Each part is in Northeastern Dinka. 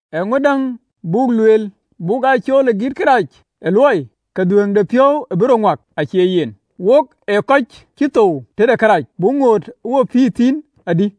Eeŋö däŋ buk lueel? Buk aa cool ë giit kërac ë luɔi, ke dhuëëŋdepiɔ̈u bï rɔt ŋuak? Acie yen! Wok kɔc cï thou tëde kërac, buk ŋoot ë wo pïïr thïn adï?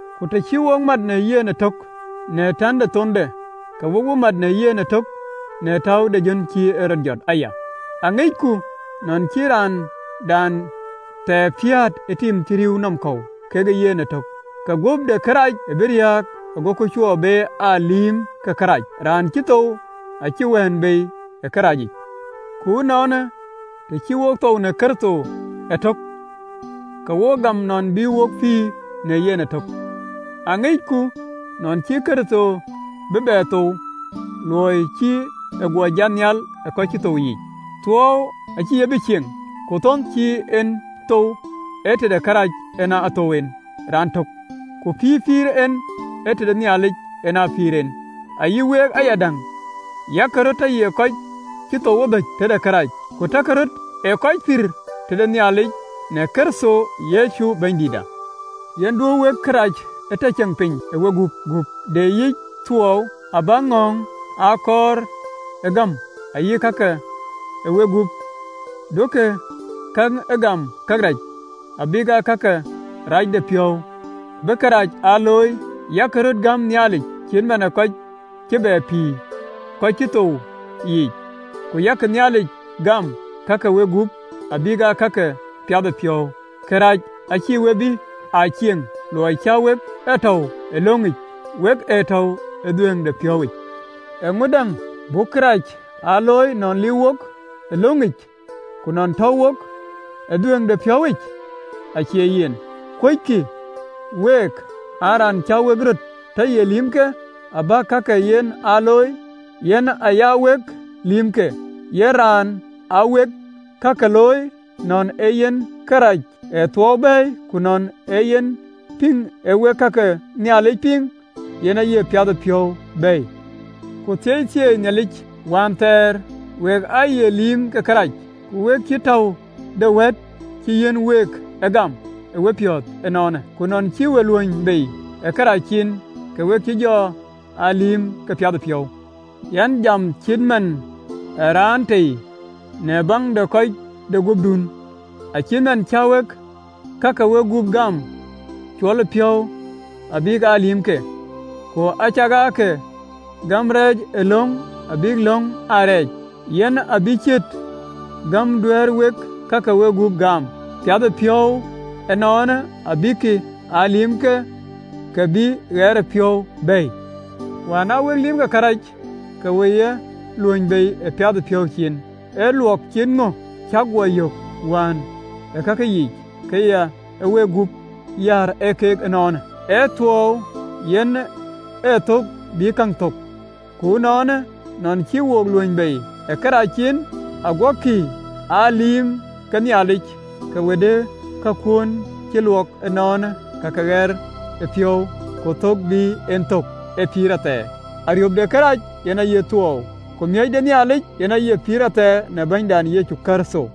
Ku të cï wo mat në yen ëtök në täu de thonde, ke wo bï mat në yen ëtök në täu de jön cï en rɔt jɔt aya. Aŋicku nɔn cï raandan thɛɛr piäät ë tim cï rïïu nɔm kɔ̈u kekë yen ëtök, ke guöp de kërac bï riääk, agoku cuö be aa lïïm ke kërac, Raan cï thou acï wɛ̈ɛ̈n bei ë këracic. Ku ënɔɔnë, të cï wok thou në Kërtho ëtök, ke wok gam nɔn bï wok pïïr në yen ëtök. Aŋicku nɔn cïï Kërtho bï bɛ thou, luɔi cï e guɔ jat nhial ë kɔc cï thou yiic, thuɔɔu acïï ye be aa cieŋ. Ku thon cï en thou, ee tëde kërac en ë thou en raantök, ku pïïr pïïr en, ee tëde Nhialic en a pïïr en. Ayï week ayadäŋ, yak röt tɔ ye kɔc cï thou ëdhöc tëde kërac, ku takï röt ë kɔc pïïr tëde Nhialic në Kërtho Yecu Bɛ̈nydïïtda. Yen duö wek kërac tɔ ceŋ piny ë wegup, gup de yiic thuɔɔu, abäk ŋɔ̈ɔ̈ŋ ee kɔɔr aa gam. Ayï ka ke wegup duökï ke gëm kërac, abïk aa ka ke racdepiɔ̈u bï kërac aa looi, yak röt gäm Nhialic cït man ë kɔc cï bɛ pïïr ë kɔc cï thou yiic, ku yak Nhialic gäm ka ke wegup abïk aa ka ke piathëpiɔ̈u. Kërac acïï we bï aa cieŋ, luɔi cä wek ee tɔ̈u ë löŋic, wek ee tɔ̈u ë dhuëëŋdepiɔ̈uwic. Eeŋö däŋ? Buk kërac aa looi nɔn liiu wok ë löŋic, ku nɔn tɔ̈u wok ë dhuëëŋdepiɔ̈uwic? Acie yen! Kuöckï week an, raan cä wek röt tɔ ye lïïmke, abäk ka ke yen aa looi, yen aya wek lïïmke, yen raan aa wek ka ke looi, nɔn ee yen kërɛɛc ee thuɔɔu bɛ̈ɛ̈i, ku nɔn ee yen pïŋ aa wek ka ke Nhialic piŋ, yen aye piathëpiɔ̈u bɛ̈ɛ̈i? Ku thieithieei Nhialic, wään thɛɛr wek aaye lïïm ke kërac, ku we cï täu de wëët cï yiɛ̈n week aa gam ë wepiɔ̈ɔ̈th ënɔɔnë. Ku ënɔn cï we luöny bei ë kërac cin, ke wek cï jɔ aa lïïm ke piathëpiɔ̈u. Yɛn jam cït man ë raan tei, në baŋ de kɔ̈c de guöpdun. Acït man cä wek ka ke wegup gäm cuɔlëpiɔ̈u abïk aa lïïmke, ku acäk ke gäm reecëlöŋ bïk löŋ aa rɛɛc, yen abï ciët gäm duɛ̈ɛ̈r wek ka ke wegup gäm piathëpiɔ̈u ënɔɔnë, abïk aa lïïmke, ke bï ɣɛɛrëpiɔ̈u bɛ̈ɛ̈i. Wään aa wek lïïm ke kërac, ke we ye luöny bei ë piathëpiɔ̈u cin. Ee luɔk cït ŋö cäk guɔ yök wään ë kake yiic, ka ya wek gup yäär ë keek ënɔɔnë? Ee thuɔɔu yen ë thök bï kake thök. Ku ënɔɔnë, nɔn cï we luöny bei ë kërac cin, aguɔkï aa lïïm ke Nhialic, ke we de kakuön cï luɔk ënɔɔnë ka ke ɣɛɛrëpiɔ̈u, ku thök bï en thök ee pïïr athɛɛr. Ariöp de kërac yen aye thuɔɔu, ku miɔ̈c de Nhialic yen aye pïïr athɛɛr në Bɛ̈nydan Yecu Kërtho.